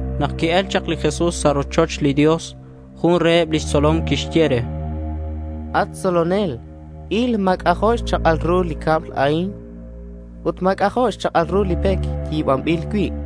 Nak qui-el chak li Jesús sa' rochoch li Dios, jun reheb lix tzolom quixye re: —At tzolonel, il, ma̱ c'ajo' xchak'al ru li cab a'in ut ma̱ c'ajo' xchak'al ru li pec yi̱banbil cui'.—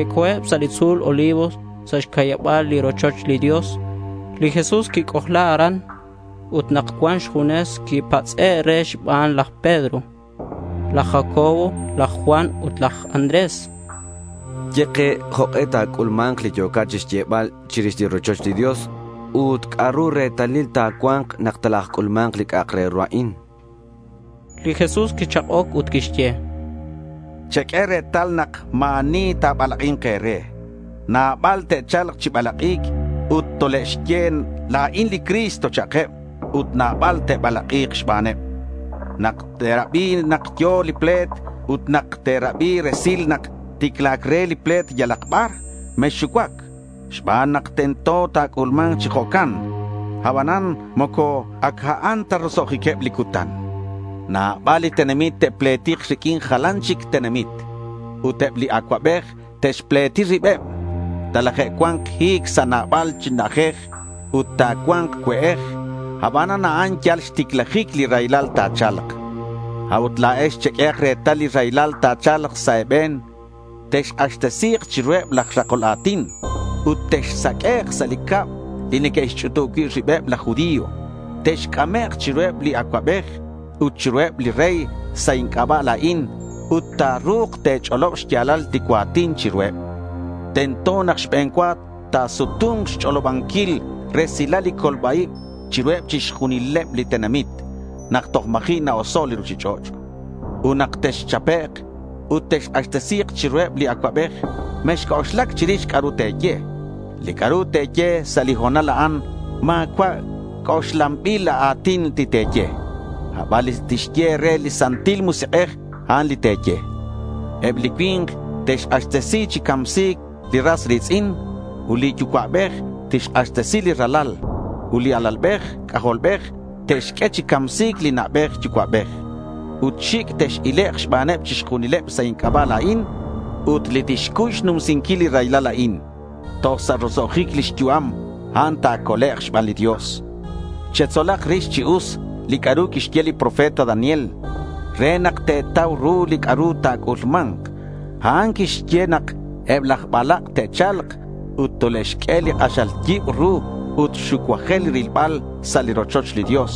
Que'co̱eb sa' li tzu̱l Olivos sa' xca'yaba̱l li rochoch li Dios. Li Jesús quic'ojla aran ut nak cuan xjunes quipatz'e' re xbaneb laj Pedro, laj Jacobo, laj Juan ut laj Andrés. —Ye ke jok'e ta̱c'ulma̱nk li yo̱cat chixyebal chirix li rochoch li Dios ut ¿c'a'ru retalil ta̱cua̱nk nak talajc'ulma̱nk li c'a'ak re ru a'in?— Li Jesús quichak'oc ut quixye: —Cheq'ue retal re nak ma̱ ani ta̱balak'i̱nk e̱re. Nabal te'cha̱lk chi balak'i̱nc ut tole'xye, “La̱in li Cristo”, cha'keb. Ut nabal te'balak'i̱k xbaneb. Nak te̱rabi nak yo̱ li ple̱t ut nak te̱rabi resil nak ticla̱c re li ple̱t yalak bar, mexxucuac xban nak tento nak ta̱c'ulma̱nk chi jo'can. Abanan moco ac a'an ta roso'jiqueb li cutan. Nabal li tenamit te'pletik riq'uin jalan chic tenamit. Ut eb li acuabej te'xpleti ribeb. Talajcua̱nk hi̱c sa' nabal chi na'ajej ut ta̱cua̱nk cue'ej. Abanan a'an yal xticlajic li raylal ta̱cha̱lk. A'ut la̱ex cheq'uehak retal li raylal ta̱cha̱lk sa' e̱be̱n. Texk'axtesi̱k chiruheb laj rakol a̱tin ut texsaq'uek' sa' li cab li neque'xch'utub cui' ribeb laj judío. Texc'amek' chiruheb li acuabej ut chiruheb li rey sa' inc'aba' la̱in ut ta̱ru̱k te̱ch'olob xya̱lal li cua̱tin chiruheb. Tento nak xbe̱n cua ta̱sutu̱nk xch'olobanquil resilal li colba-ib chiruheb chixjunil li tenamit nak toj ma̱ji' na-oso' li ruchich'och'. Ut nak texchapek' ut texk'axtesi̱k chiruheb li acuabej, mexc'oxlac chirix li c'a'ru te̱ye. Li c'a'ru te̱ye sa' li ho̱nal a'an ma̱cua' c'oxlanbil a̱tin li te̱ye. Aban li tixye e̱re li Santil Musik'ej, a'an li te̱ye. Eb li cui̱nk te'xk'axtesi chi camsi̱c li ras ri̱tz'in. Ut li yucua'bej tixk'axtesi li ralal. Ut li alalbej c'ajolbej te'xq'ue chi camsi̱c li na'bej yucua'bej. Ut xic' tex-ilek' xbaneb chixjunileb sa' inc'aba' la̱in. Ut li tixcuy xnumsinquil li raylal a'in toj sa' roso'jic lix yu'am, a'an ta̱colek' xban li Dios. Chetzolak rix chi us li c'a'ru quixye li profeta Daniel re nak te̱tau ru li c'a'ru ta̱c'ulma̱nk. A'an quixye nak eb laj balak' te'cha̱lk ut tole'xq'ue li k'axal yibru ut xucuajel rilbal sa' li rochoch li Dios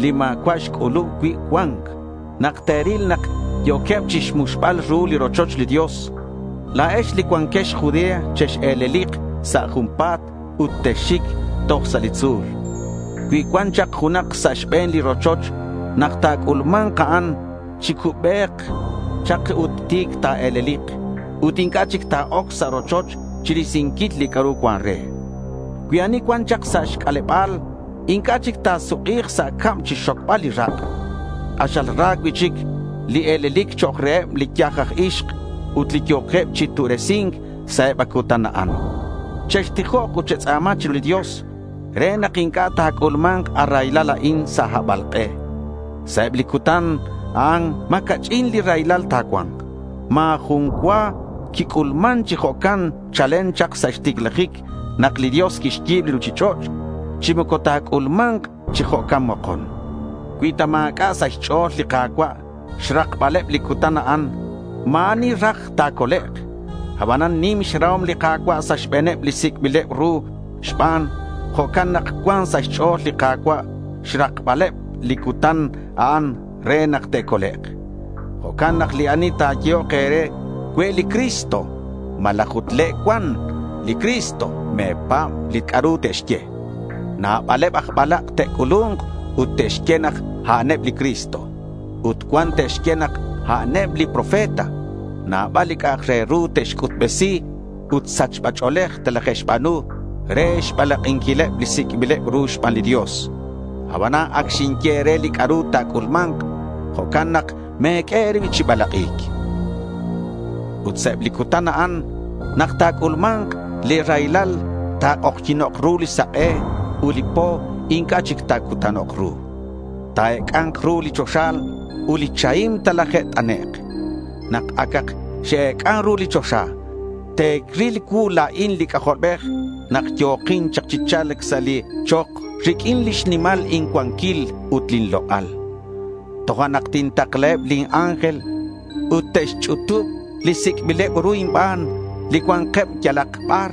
li ma̱cua' xc'ulub cui' cua̱nc. Nak te̱ril nak yo̱queb chixmuxbal ru li rochoch li Dios, la̱ex li cuanquex Judea chex-e̱lelik sa' junpa̱t ut texxic toj sa' li tzu̱l. Cui cuan chak junak sa' xbe̱n li rochoch nak ta̱c'ulma̱nk a'an, chi cubec chak ut ti̱c ta̱e̱lelik ut inc'a' chic ta̱oc sa' rochoch chirisinquil li c'a'ru cuan re. Cui ani cuan chak sa' xc'aleba̱l inc'a' chic ta̱suk'i̱k sa' cab chixxocbal li rak'. K'axal ra cui'chic li e̱lelic chok' reheb li yaj aj ixk ut li yo̱queb chi tu'resi̱nk sa' eb a cutan a'an. Chextijok ut chetz'a̱ma chiru li Dios re nak inc'a' ta̱c'ulma̱nk a raylal a'in sa' habalk'e. Sa' eb li cutan a'an ma̱ ca'ch'in li raylal ta̱cua̱nk. Ma̱ jun cua quic'ulman chi jo'can chalen chak sa' xticlajic nak li Dios quixyi̱b li ruchich'och', chi moco ta̱c'ulma̱nk chi jo'can mokon. Cui ta ma̱c'a' sa' xch'o̱l li Ka̱cua' xrakbaleb li cutan a'an ma̱ ani raj ta̱colek'. Abanan nim xrahom li Ka̱cua' sa' xbe̱neb li sic'bileb ru xban. Jo'can nak cuan sa' xch'o̱l li Ka̱cua' xrakbal eb li cutan a'an re nak te'colek'. Jo'can nak ani ta̱yehok e̱re, “Cue' li Cristo”, malaj, “le' cuan li Cristo”, me̱pa̱b li c'a'ru te'xye. Nabaleb aj balak' te'c'ulu̱nk ut te'xye nak a'aneb li Cristo. Ut cuan te'xye nak a'aneb li profeta. Nabal li c'a'ak re ru te'xc'utbesi ut sachba ch'o̱lej telaje'xba̱nu re xbalak'inquileb li sic'bileb ru xban li Dios. Abanan ac xinye e̱re li c'a'ru ta̱c'ulma̱nk. Jo'can nak me̱q'ue e̱rib chi balak'i̱c. Ut sa' eb li cutan a'an nak ta̱c'ulma̱nk li raylal, ta̱k'ojyi̱nok' ru li sak'e ut li po inc'a' chic ta̱cutanok' ru. Ta̱ec'a̱nk ru li choxa ut li chahim telaje't'anek'. Nak acak x-ec'an ru li choxa, te'ril cuu la̱in li C'ajolbej nak yo̱kin chak chi cha̱lc sa' li chok riq'uin lix nimal incuanquil ut lin lok'al. Tojo'nak tintaklaheb lin ángel ut te'xch'utub li sic'bileb ru inban li cua̱nkeb yalak bar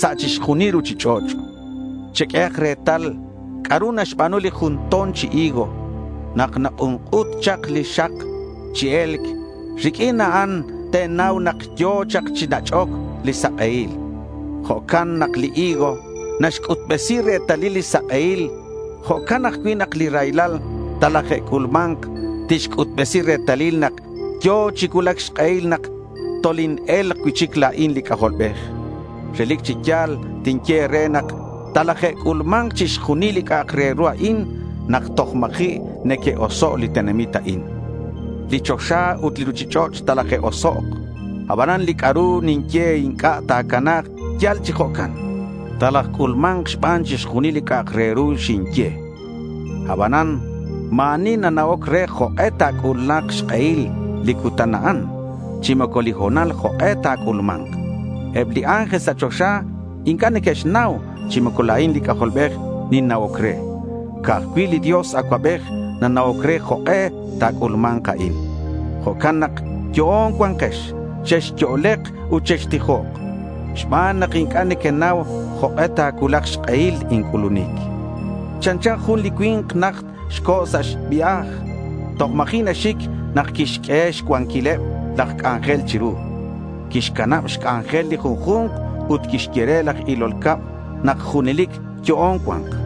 sa' chixjunil li ruchich'och'. Cheq'uehak retal c'a'ru naxba̱nu li jun to̱n chi higo. Nak nak'unk'ut chak li xak chi e̱lc, riq'uin a'an te̱nau nak yo̱ chak chi nach'oc li sak'ehil. Jo' nak li higo naxc'utbesi retalil li sak'ehil, jo'can ajcui' nak li raylal talaje'c'ulma̱nk tixc'utbesi retalil nak yo̱ chi cuulac xk'ehil nak toline̱lk cui'chic la̱in li C'ajolbej. Relic chi ya̱l tinye e̱re nak talaje'c'ulma̱nk chixjunil li c'a'ak re ru a'in nak toj ma̱ji' neque'oso' li tenamit a'in. Li choxa ut li ruchich'och' talaje'osok'. Abanan li c'a'ru ninye inc'a' ta̱cana̱k yal chi jo'can. Talajc'ulma̱nk ban chixjunil li c'a'ak re ru xinye. Abanan ma̱ ani nana'oc re jok'e ta̱cuulak xk'ehil li cutan a'an chi moco li ho̱nal jok'e ta̱c'ulma̱nk. Eb li ángel sa' choxa inc'a' neque'xnau chi moco la̱in li C'ajolbej ninna'oc re. Ca'aj cui' li Dios Acuabej nana'oc re jok'e ta̱c'ulma̱nk a'in. Jo'can nak yo'on cua̱nkex. Chexyo'lek ut chextijok xban nak inc'a' nequenau jok'e ta̱cuulak xk'ehil inc'ulunic. Chanchan jun li cui̱nk najt co̱ sa' xvia̱j. Toj ma̱ji' naxic nak quixq'ueheb xcuanquileb laj c'anjel chiru. Quixcanab xc'anjel li junju̱nk. Ut quixye re laj ilol cab nak junelic yo'on cua̱nk.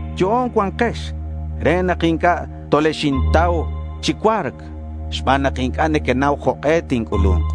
Yo'on cua̱nkex re nak inc'a' tolexintau chi cua̱rc xban nak inc'a' nequenau jok'e tinc'ulu̱nk.